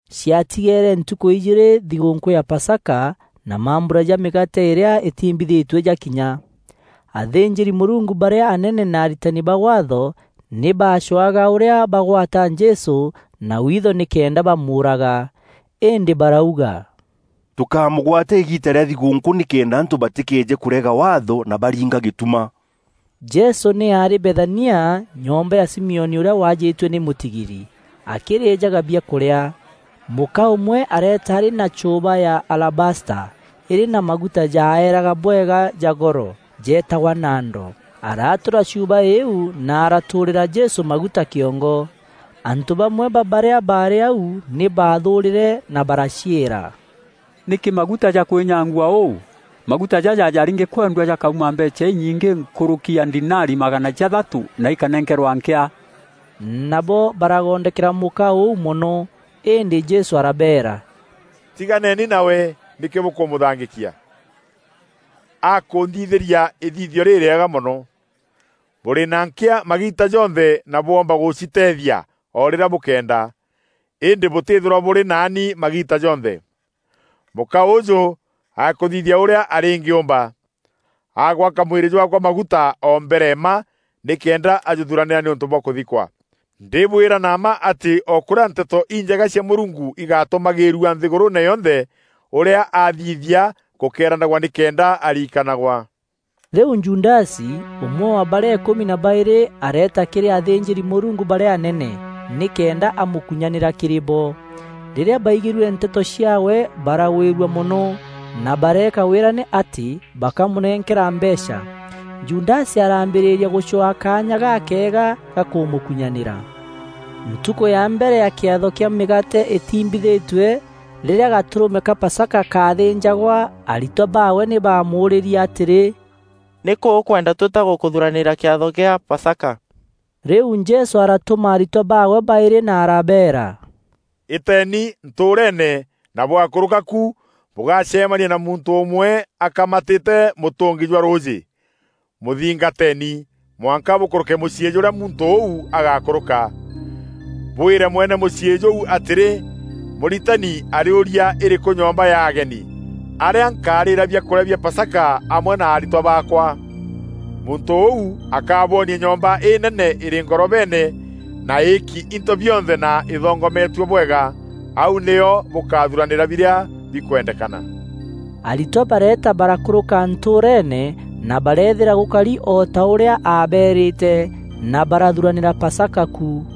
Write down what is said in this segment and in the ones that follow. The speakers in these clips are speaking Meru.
Ciatigeere ntukû ijîîrî thigûûnkû ya Pasaka na mambura ja mîgaate îrîa îtiimbithîtue jakinya. Athînjîri-Mûrungu barîa anene na aritani ba Waatho nî baacwaga ûrîa bagwata Jesû na witho nîkenda bamûûraga. Îndî barauga, “Tûkámûgwata îgiita rîa thigûûnkû nîkenda antû batîkeeje kûrega Waatho na baringa gîtuma.” Jesû nî aarî Bethania, nyomba ya Simioni ûrîa waajîtue nî mûtigiri, akîrîjaga biakûrîa. Mûka ûmwe areeta arî na chuuba ya alabasta îrî na maguta jaeeraga bwega ja goro, jeetagwa nado. Aratura chuuba îîu na aratûrîra Jesû maguta kîongo. Antû bamwe ba barîa baarî au nî baathûrîre na baraciîra, “Nîkî maguta jakwînyangua ûu? Maguta jaja jarîngîkwendua jakauma mbeecha inyingî nkûrûki ya ndinari magana jathatû, na ikanenkerwa nkîa!” Nabo baragondokera mûka ûu mono. Îndî Jesû arabeera, “Tiganeni nawe, nîkî bûkûmûthangîkia? Akûnthithîria îthithio rîrîega mono. Bûrî na nkîa magiita jonthe na bwoomba gûciteethia o rîrîa bûkeenda, îndî bûtîîthîrwa bûrî naani magiita jonthe. Mûka ûjû akûthithia ûrîa arîngîûmba. Agwaka mwîrî jwaakwa maguta o mbere mma nîkenda ajûthuranîra nîûntû bwa kûthikwa. Ndîbwîra na mma atî o kûrîa Nteto Injega cia Mûrungu igatûmagîîrua nthîgûrûûne yonthe, ûrîa athithia gûkeeranagwa nîkenda ariikanagwa.” Rîu Judasi, ûmwe wa barîa îkûmi na baîrî, areeta kîrî athînjîri-Mûrungu barîa anene, nîkenda amûkunyanîra kîrî bo. Rîrîa baigîrue nteto ciaawe, baragwîrua mono, na bareeka wîrane atî bakamûnenkera mbeecha. Judasi araambîrîria gûcwaa kaanya gakeega ga kûmûkunyanîra. Ntukû ya mbere ya kîatho kîa Mîgaate îtiimbîthitue, rîrîa gatûrûme ka Pasaka kaathînjagwa, aritwa baawe nî baamûûrîrie atîrî, “Nîkû ûkwenda twîta gûkûthuranîîra kîatho gîa Pasaka?” Rîu Jesû aratuma aritwa baawe baîrî na arabeera, “Îteeni ntûûreene na bwakûrûka ku bûgacemania na muntû ûmwe akamatîte mûtûngi jwa rûûjî. Mûthingateeni, mwanka bûkûrûke mûciî jûrîa muntû ûu agakûrûka. Bwîre mwene mûciî jûu atîrî, ‘Mûritani arîûria, îrîkû nyomba ya ageni, arîa nkarîîra biakûrîa bia Pasaka amwe na aritwa baakwa?’ Muntû ûu akabwonia nyomba înene îrî ngorobeene na îîki into bionthe na îthongometue bwega. Auu nîo bûkathuranîra birîa bikwendekana.” Aritwa bareeta barakûrûka ntûûreene na bareethîra gûkari o ta ûrîa aabeerîte na barathuranîra Pasaka ku.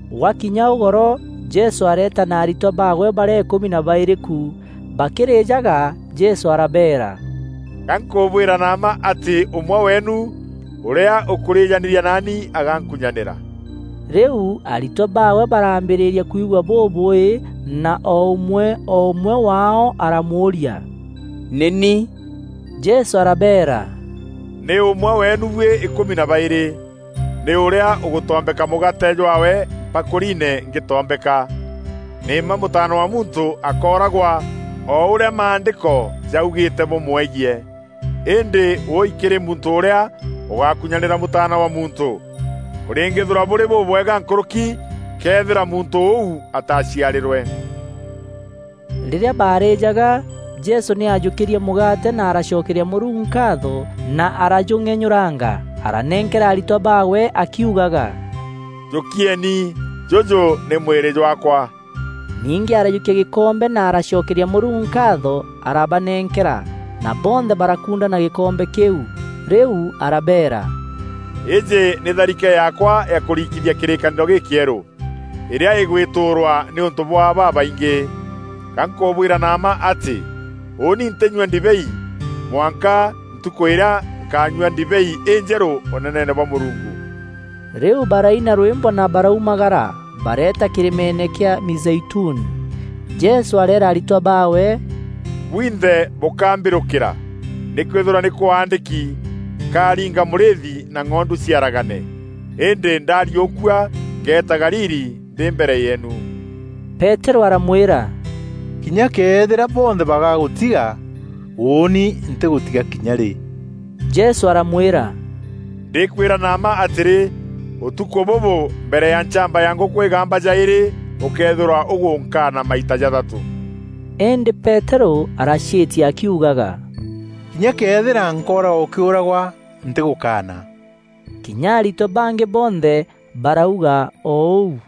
Gwakinya ûgoro, Jesû areeta na aritwa baawe barîa îkûmi na baîrî ku. Bakîrîjaga, Jesû arabeera, “Ga nkûbwîra na mma atî ûmwe weenu, ûrîa ûkûrîjanîra naani agankunyanîra.” Rîu aritwa baawe baraambîrîria kwigua bûbûûî na o ûmwe o ûmwe waao aramûûria, “Nî ni?” Jesû arabeera, “Nî ûmwe weenu buî îkûmi na baîrî, nî ûrîa ûgûtombeka mûgaate jwaawe mpakûriine ngîtombeka. Nî mma Mûtaana wa Muntû akooragwa o ûrîa Maandîko jaugîîte bûmwegiî. Îndî wûûi kîrî muntû ûrîa ûgakunyanîra Mûtaana wa Muntû! Kûrîngîîthîrwa bûrî bûbwega nkûrûki këethîra muntû ûu ataciarîrwe!” Rîrîa baarîjaga, Jesû nî aajûkîrie mûgaate na aracokeria Mûrungu nkaatho na arajûng'enyûranga, aranenkera aritwa baawe akiugaga, “Jûkieni, jûjû nî mwîrî jwaakwa.” Ningî arajûkia gîkombe na aracokeria Mûrungu nkaatho arabanenkera na bonthe barakundana gîkombe kîu. Rîu arabeera, “Îîjî nî tharike yaakwa ya kûrikithia kîrîkanîro gîkîerû, îrîa îgwîtûûrwa nîûntû bwa babaingî. Ga nkûbwîra na mma atî ûûni ntînyua ndibei, mwanka ntukû îrîa nkaanyua ndibei înjerû Ûneneene bwa Mûrungu.” Rîu baraina rwîmbo na baraumagara bareeta kîrîmeene kîa Mîzeituni. Jesû areera aritwa baawe, “Bwinthe bûkambîrûkîra, nîkwîthîrwa nî kwaandîki, ‘Nkariinga mûrîîthi na ng'ondu ciaragane.’ Îndî ndariûkua ngeeta Galili ndî mbere yeenu.” Peterû aramwîra, “Kinya këethîra bonthe bagagûtiga, ûûni ntîgûtiga kinya rî.” Jesû aramwîra, “Ndîkwîra na mma atîrî, ûtukû bûbû mbere ya nchamba ya ngûkû îgamba jaîrî, ûkeethîrwa ûgûnkaana maita jathatû.” Îndî Peterû araciîtia akiugaga, “Kinya këethîra nkooragwa ûkîûragwa, ntîgûkaana.” Kinya aritwa bangî bonthe barauga o ûu.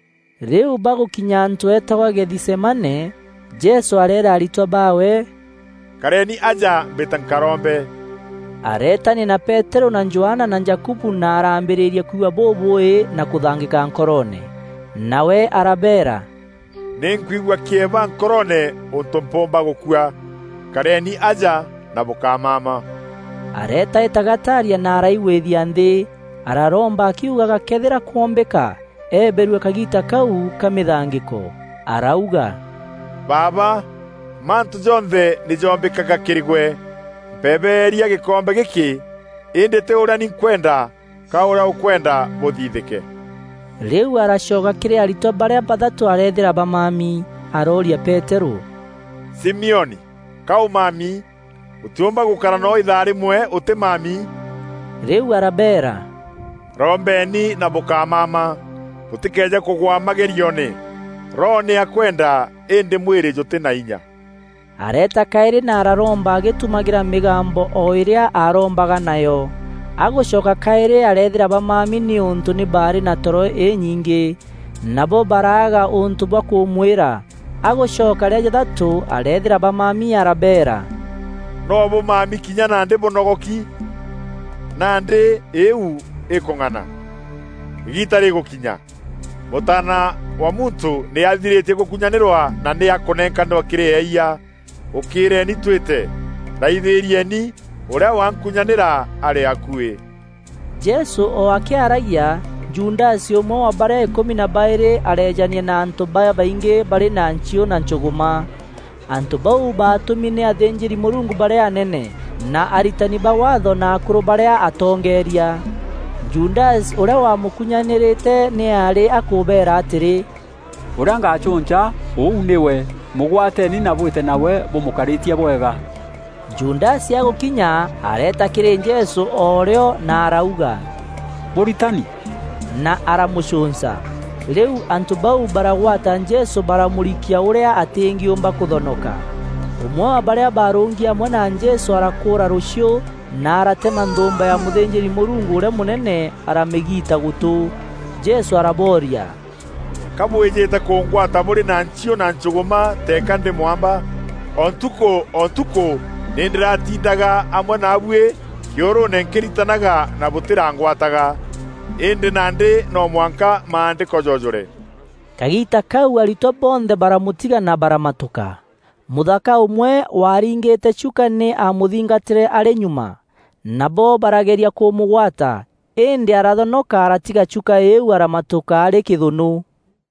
Rîu bagûkinya antû eetagwa Gethisemane, Jesû areera aritwa baawe, “Kareni aja mbîte nkarombe.” Areetania na Peterû na Johana na Jakubu na araambîrîria kwigua bûbûûî na kûthangîka nkoroone. Nawe arabeera, “nî nkwigua kîeba nkoroone ûntû mpûûmba gûkua. Kareni aja na bûkámama.” Areetaîta gataaria na araigwithia nthî, araromba akiugaga këethîra kwombîka, eeberue kagiita kau ka mîthangîko. Arauga, “Baaba, mantû jonthe nî joombîkaga kîrî gwe. Mpebeeria gîkombe gîkî, îndî tî ûrîa ni nkwenda, ka ûrîa ûkwenda bûthithîke.” Rîu aracoka kîrî aritwa barîa bathatû areethîra bamami. Arooria Peterû, “Simioni, ka ûmami? Ûtîûmba gûkara noo îthaa rîmwe ûtîmami?” Rîu arabeera, “Rombeni na bûkámama, bûtîkeeje kûgwa magerioone. Roho nî akwenda, îndî mwîrî jûtî na inya.” Areeta kaîrî na araromba agîtumagîra mîgambo o îrîa arombaga nayo. Agûcoka kaîrî areethîra bamami nîûntû nî baarî na toro înyingî. Nabo baraaga ûntû bwa kûmwîra. Agûcoka rîa jathatû areethîra bamami arabeera, “Noo bûmami kinya nandî bûnogoki? Nandî îîu îkûng'ana! Îgiita rîgûkinya! Mûtaana wa Muntû nî athirîtie gûkunyanîrwa na nî akûnenkanîrwa kîrî eeyia. Ûkîîreeni twîte. Raithîrieni, ûrîa wankunyanîra arî akuî.” Jesû o akîaragia, Judasi, ûmwe wa barîa îkûmi na baîrî, areejania na antû babaingî barî na nchiû na nchûgûma. Antû bau baatûmi nî athînjîri-Mûrungu barîa anene, na aritani ba Waatho na akûrû barîa atongeeria. Judasi, ûrîa wamûkunyanîrîte nî aarî akûbeera atîrî, “Ûrîa ngacûnca, ûu nîwe; mûgwateeni na bwîte nawe bûmûkarîtie bwega.” Judasi agûkinya, areeta kîrî Jesû o rîo na arauga, “Mûritani!” Na aramûcûnca. Rîu antû bau baragwata Jesû baramûrikia ûrîa atîngîûmba kûthonoka. Ûmwe wa barîa baarûngi amwe na Jesû arakûûra rûchiû na aratema nthûûmba ya mûthînjîri-Mûrungu ûrîa mûnene aramîgiita gûtû. Jesû arabooria, “Ka bwîjîte kûngwata bûrî na nchiû na nchûgûma teeka ndî mwamba? O ntukû o ntukû nî ndîratindaga amwe naabuî kîûrûûne nkîritanaga na bûtîrangwataga. Îndî nandî no mwanka Maandîko joojûre.” Kagiita kau aritwa bonthe baramûtiga na baramatûka. Mûthaka ûmwe waariingîte chuka nî aamûthingatîre arî nyuma. Nabo barageria kûmûgwata îndî arathonoka aratiga chuka îîu aramatûka arî kîthûnû.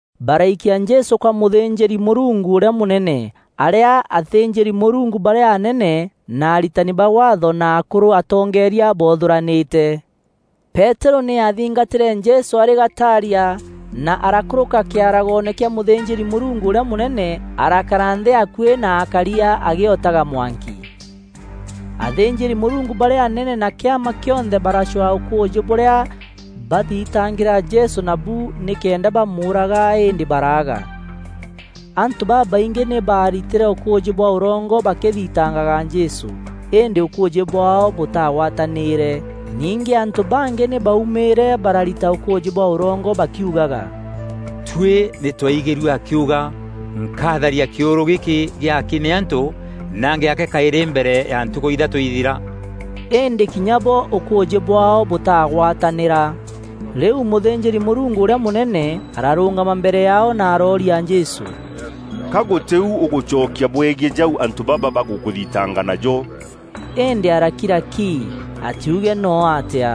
Baraikia Jesû kwa mûthînjîri-Mûrungu ûrîa mûnene, arîa athînjîri-Mûrungu barîa anene na aritani ba Waatho na akûrû atongeeria boothûranîte. Peterû nî aathingatîre Jesû arî gataaria, na arakûrûka kîaragoone kîa mûthînjîri-Mûrungu ûrîa mûnene arakara nthî akuî na akaria agîotaga mwanki. Athînjîri-Mûrungu barîa anene na kîama kîonthe baracwaa ûkûûjî bûrîa bathitangîra Jesû nabu nîkenda bamûûraga, îndî baraaga. Antû babaingî nî baaritîre ûkûûjî bwa ûrongo bakîthitangaga Jesû îndî ûkûûjî bwaao bûtagwatanîîre. Ningî antû bangî nî baumîîre bararita ûkûûjî bwa ûrongo bakiugaga, “Tuî nî twaigîrue akiuga, ‘Nkatharia kîûrû gîkî gîaki nî antû, na ngîake kaîrî mbere ya ntukû ithatû ithira.’” Îndî kinya bo ûkûûjî bwaao bûtaagwatanîra. Rîu mûthînjîri-Mûrungu ûrîa mûnene ararûngama mbere yaao na arooria Jesû, “Ka gûtî u ûgûcokia bwegiî jau antû baba bagûkûthitanga najo?” Îndî arakira ki, atiuge noo atîa.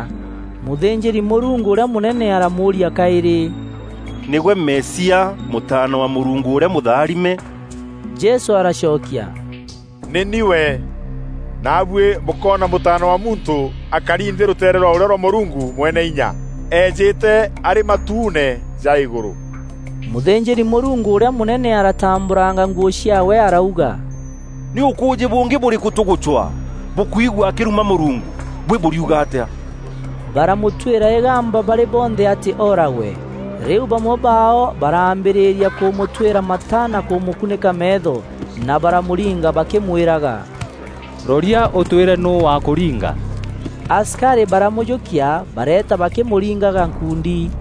Mûthînjîri-Mûrungu ûrîa mûnene aramûûria kaîrî, “Nîgwe Mesia, Mûtaana wa Mûrungu ûrîa Mûtharime?” Jesû aracokia, “Nî ni we. Naabuî bûkoona Mûtaana wa Muntû akari nthî rûteere rwa ûrîo rwa Mûrungu Mweneinya, eejîte arî matuune ja îgûrû.” Mûthînjîri-Mûrungu ûrîa mûnene aratambûranga nguû ciaawe arauga, “Nî ûkûûjî bûngî bûrîkû tûgûcwa? Bûkwigua akîruma Mûrungu! Buî bûriuga atîa?” Baramûtwîra îgamba barî bonthe atî ooragwe. Rîu bamwe baao baraambîrîria kûmûtwîra mata na kûmûkunîka meetho, na baramûringa bakîmwîraga, “Roria ûtwîre nûû wakûringa.” Asikarî baramûjûkia bareeta bakîmûringaga nkuundi.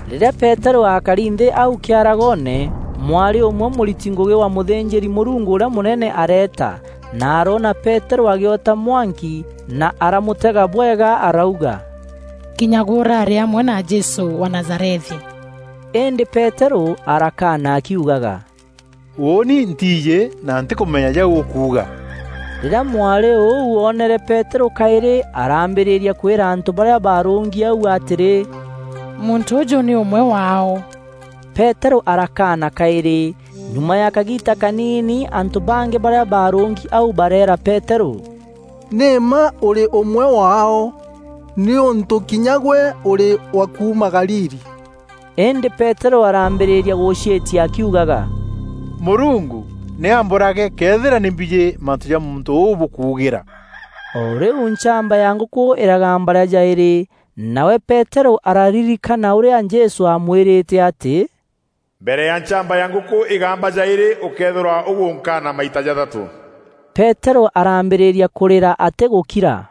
Rîrîa Peterû akari nthî au kîaragoone, mwarî ûmwe mûriti ngûgî wa mûthînjîri-Mûrungu ûrîa mûnene areeta na oroona Peterû agîota mwanki na aramûtega bwega arauga, “Kinya gwe ûraarî amwe na Jesû wa Nazarethi.” Îndî Peterû arakaana akiugaga, “Ûûnî ntiijî na ntîkûmenya jau ûkuuga.” Rîrîa mwarî ûu oonere Peterû kaîrî, arambîrîria kwîra antû barîa baarûûngi au atîrî, “Muntû ûjû nî ûmwe waao.” Peterû arakaana kaîrî. Nyuma ya kagiita kaniini antû bangî barîa baarûûngi au bareera Peterû, “Nî mma ûrî ûmwe waao nîûntû kinya gwe ûrî wa kuuma Galili.” Îndî Peterû araambîrîria na gûciîtia akiugaga, “Mûrungu nî ambûrage këethîra nî mbîjî mantû ja muntû ûu bûkuugîra.” O rîu nchamba ya ngûkû îragamba rîa jaîrî. Nawe Peterû araririkana ûrîa Jesû aamwîrîte atî, “Mbere ya nchamba ya ngûkû îgamba jaîrî ûkeethîrwa ûgûnkaana maita jathatû.” Peterû araambîrîria kûrîra atîgûkira.